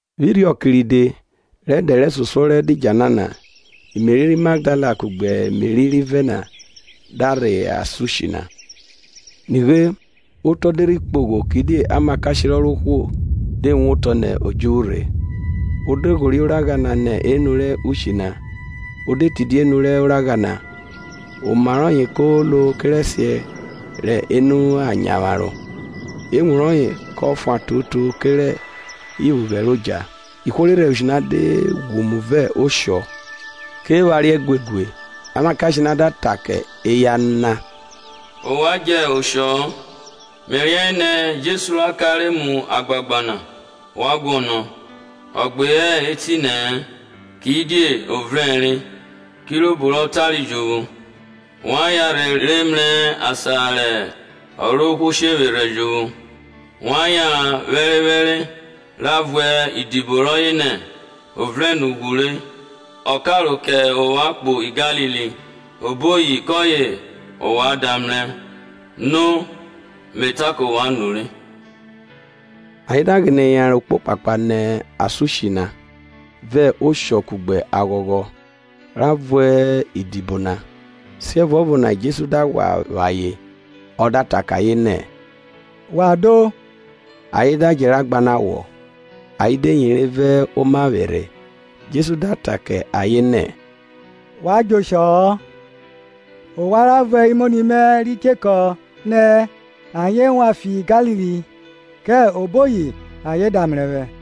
Vwẹ irhiọke ride, rẹ ẹdẹ rẹsosuọ rẹ ẹdidjala na, Meri ri Magdala kugbe Meri rivẹ na da rhẹ asan ushi na. Nighe otọ de rhi kpogho; kidie amakashe rẹ Ọrovwohwo de wotọ nẹ odjuvwu rhe, o de ghorie oragha na nẹ unu rẹ ushi na, o de tidia enu rẹ oragha na. Oma rọye ko lo kerẹsiẹ rẹ enu a nyavwaro, ewun rọye kọ fuan toto kerẹ iphughẹ rẹ odja. Ihwo re rhẹrẹ ushi na da ghwumu vẹ oshọ, ke phariẹ guegue. Amakashe na da ta kẹ eya na, Ovwan djẹ oshọ-ọ. Me riẹnre nẹ Jesu ra kare mu agbagba na ovwan guọnọ. Ọ gbe hẹ etinẹ-ẹ; kidie o vrẹnre, kirobo ro tare jovwo. Wa yanrhe rhe mrẹ asan rẹ Ọrovwohwo shevwerhẹ jovwo. Wa yanran okpokpakpa, ra vuẹ idibo rọye nẹ, o vrẹn nẹ ughwu re; ọ karo kẹ ovwan kpo Galili; oboyi kọye ovwan da mrẹ. Nighere, me ta kẹ ovwan nure. Ayen de ghine yanran okpokpakpa nẹ asan ushi na vẹ oshọ kugbe aghọghọ, ra vuẹ idibo na. Siẹvuọvo na Jesu da ghwa vwa ayen, ọ da ta kẹ ayen nẹ, Wa do. Ayen da djẹ ra gbanọ awọ, ayen de yere vẹ omavwerhovwẹ. Jesu da ta kẹ ayen nẹ, Wa djẹ oshọ-ọ; ovwan ra vuẹ imoni mẹ ri chekọ nẹ, ayen wan fi Galili, kẹ oboyi ayen da mrẹ vwẹ.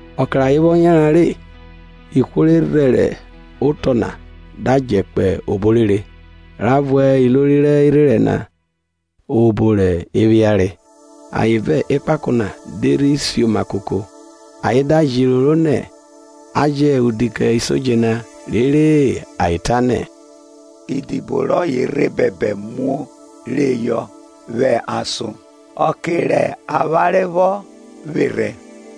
Ọke rẹ ayen vwọ yanran rẹ, ihwo re rhẹrẹ otọ na da djẹ kpo obo orere, ra vuẹ ilori rẹ irherẹn na obo re phiare. Ayen vẹ ekpako na de rhi sioma koko, ayen da jẹ iroro nẹ, a jẹ udi kẹ isodje na, rere ayen ta nẹ, Idibo rọye rhe bẹbẹ muo reyọ vwẹ ason, ọke rẹ avwanre vwọ vwerhẹ.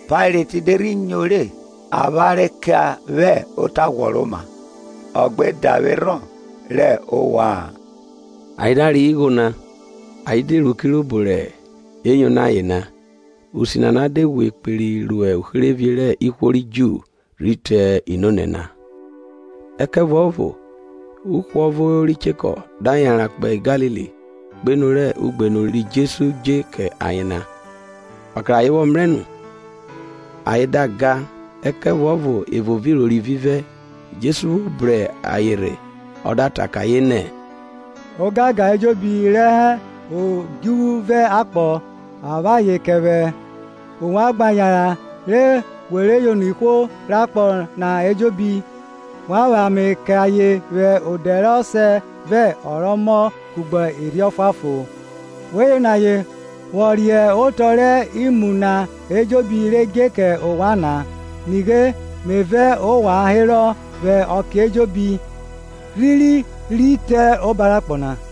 Pailet de rhi nyo re, avwanre ke vwẹ ota ghwọroma, ọ gbe davwerhọn rẹ ovwa-an. Ayen da reyọ igho na, ayen de ru kirobo re yono ayen na. Usi nana de ghwe kperi ro uherevie rẹ ihwo ri Ju rhi te nonẹ na. Ẹkẹvuọvo uhwọvo ri chekọ da yanran kpo Galili, kpo enu rẹ ugbenu ri Jesu dje kẹ ayen na. Ọke rẹ ayen vwọ mrẹ nu ayen da ga, ẹkẹvuọvo evo vẹ iroro ivivẹ. Jesu vwo bru ayen rhe ọ da ta kẹ ayen nẹ, Ogangan ejobi re hẹ odjuvwu vẹ akpọ, a vwe ayen kẹ vwẹ. Ovwan gba yanran re we re yono ihwo rẹ akpọ na ejobi, wa vwẹ ame kẹ ayen vwẹ odẹ rẹ Ọsẹ vẹ ọ rẹ Ọmọ kugbe Erhi Ọfuanfon. Wẹ yono ayen vwọ riẹn otọ rẹ imu na ejobi re dje kẹ ovwan na. Nighe, me vẹ ovwan herọ vwẹ ọke ejobi, rhiri rhi te oba rẹ akpọ na.